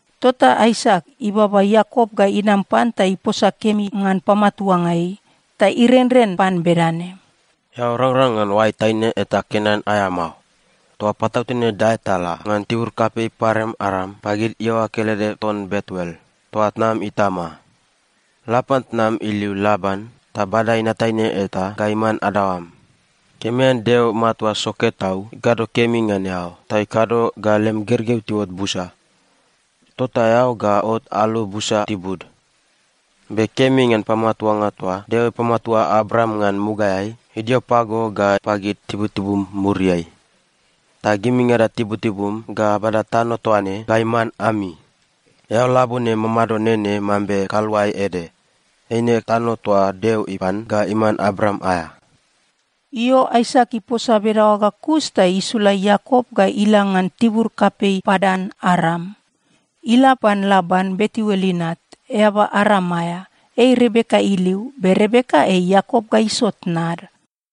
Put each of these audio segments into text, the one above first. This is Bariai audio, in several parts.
Tota Aisak ibaba Iakop ga inam pan ta iposa kemi ngan pamatuanga ei. Ta irenren pan bedane, “Eao rangrang ngan oai taine eta Kenan aea mao. Toa patautene dae ta la ngan tibur kapei Padan-Aram pagid iaoa kelede ton Betuel, toa tnam itama. La pan tnam iliu Laban ta bada inat taine eta ga iman adaoam. Kemi ngan Deo Matua Soke Tau ikado kemi ngan eao, ta ikado ga lem gergeu tiuot busa. Tota eao ga ot alu busa tibud. Be kemi ngan pamatuanga toa Deo ipamatua Abraam ngan mugaeai, idio pago ga pagid tibutibum muriai. Ta gimingada tibutibum ga abada tano toa ne ga iman ami. Eao labone mamado nene mambe kaluae ede. Eine tano toa Deo ipan ga iman Abraam aea.” Io, Aisak iposa bedaoa ga kus ta isula Iakop ga ila ngan tibur kapei Padan-Aram. Ila pan Laban, Betuel inat, eaba Aram aea. Ei Rebeka iliu. Be Rebeka ei Iakop ga Iso tnad.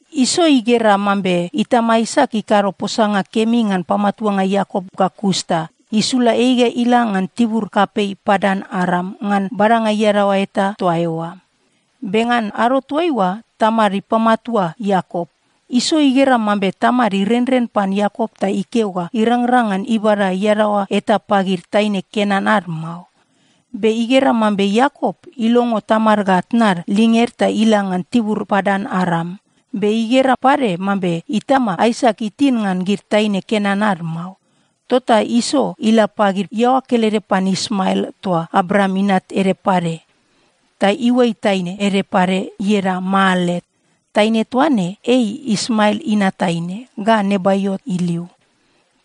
Iso igera mambe itama Aisak ikado posanga kemi ngan pamatuanga Iakop ga kus ta isula ei ga ila ngan tibur kapei Padan-Aram ngan badanga iadaoa eta toa eoa. Be ngan ado toaiua tamad ipamatua Iakop, Iso igera mambe tamad irenren pan Iakop ta ikeo ga irangrang ngan ibada iadaoa eta pagid taine Kenan ad mao. Be igera mambe Iakop ilongo tamad ga tnad linged ta ila ngan tibur Padan-Aram. Be igera pade mambe itama Aisak itin ngan gid taine Kenan ad mao. Tota Iso ila pagid iaoa kelede pan Ismael toa Abraam inat ede pade, ta iuai taine ede pade, ieda Maalat. Taine toa ne ei Ismael inat taine ga Nebaiot iliu.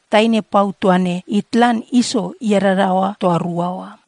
Taine pau toa ne itlan Iso iadadaoa toa rua oa.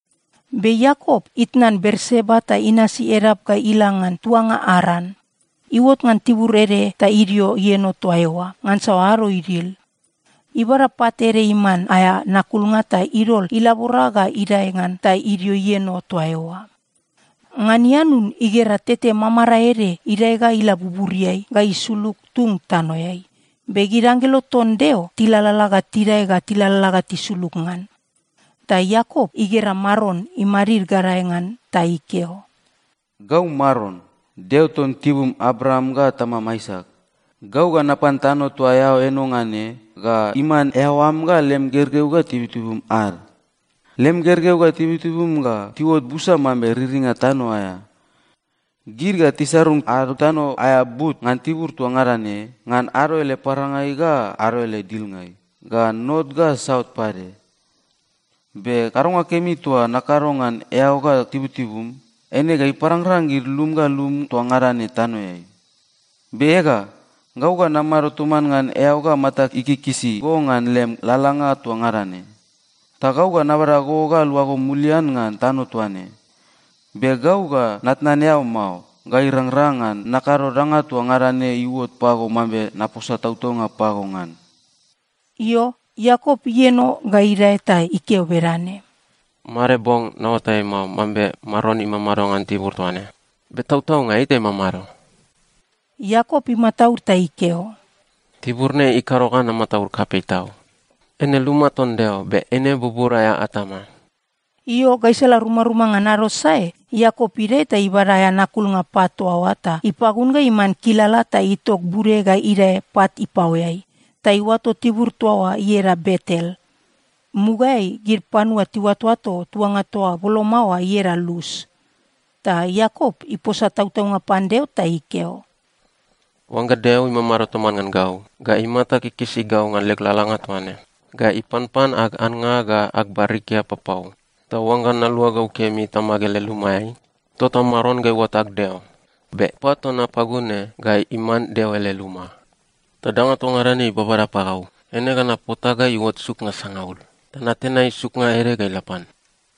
Be Iakop itnan Berseba ta inasi edap ga ila ngan tuanga Aran. Iuot ngan tibur ede ta idio ieno toa eoa, ngansa ado idil. Ibada pat ede iman aea nakulnga ta idol ilabora ga idae ngan ta idio ieno toa eoa. Ngan ianun igera tete mamarae ede idae ga ila buburiai ga isulug tung tanoeai. Be gid anggelo ton Deo tilalala ga tidae ga tilalala ga tisulug ngan. Ta Iakop igera Maron imadid gadae ngan ta ikeo, “Gau Maron, Deo ton tibum Abraam ga tamam Aisak. Gau ga napan tano toa eao eno ngan ne ga iman eao am ga lem gergeu ga tibutibum ad. Lem gergeu ga tibutibum ga tiuot busa mambe riringa tano aea. Gid ga tisarung ad tano aea but ngan tibur toa ngada ne, ngan ado ele parangai ga ado ele dilngai, ga not ga saut pade. Be kadonga kemi toa nakado ngan eao ga tibutibum, eine ga iparangrang gid lum ga lum toa ngada ne tanoeai. Be ega, gau ga namado toman ngan eao ga matag ikikisi go ngan lem lalalanga toa ngada ne. Ta gau ga nabada go ga luago mulian ngan tano toa ne. Be gau ga natnan eao mao ga irangrang ngan nakado danga toa ngada ne iuot pago mambe naposa tautaunga pago ngan.” Io, Iakop ieno ga idae ta ikeo bedane, “Made bong naoatai mao mambe Maron imamado ngan tibur toa ne. Be tautaunga ei ta imamado!” Iakop imataud ta ikeo, “Tibur ne ikado ga namataud kapei tau. Eine luma ton Deo. Be eine bubur aea atama.” Io, gaisala rumaruma ngan ado sae, Iakop idae ta ibada aea nakulnga pat toa oa ta ipagun ga iman kilala ta itok bude ga idae pat ipaoeai. Ta iuato tibur toa oa ieda Betel. Mugaeai gid panua tiuatoato tuanga ga boloma oa ieda Lus. Ta Iakop iposa tautaunga pan Deo ta ikeo, “Oangga Deo imamado toman ngan gau ga imata kikisi gau ngan leg lalalanga toa ne, ga ipanpan ag annga ga ag barikia papau, ta oangga naluagau kemi tamag ele lumaeai, tota Maron ga iuot ag Deo. Be pat toa napagun ne ga iman Deo ele luma. Ta danga toa ngada ne ibabada pagau, eine ga napota ga iuot suknga sangaul, ta natenai suknga ede ga ila pan.”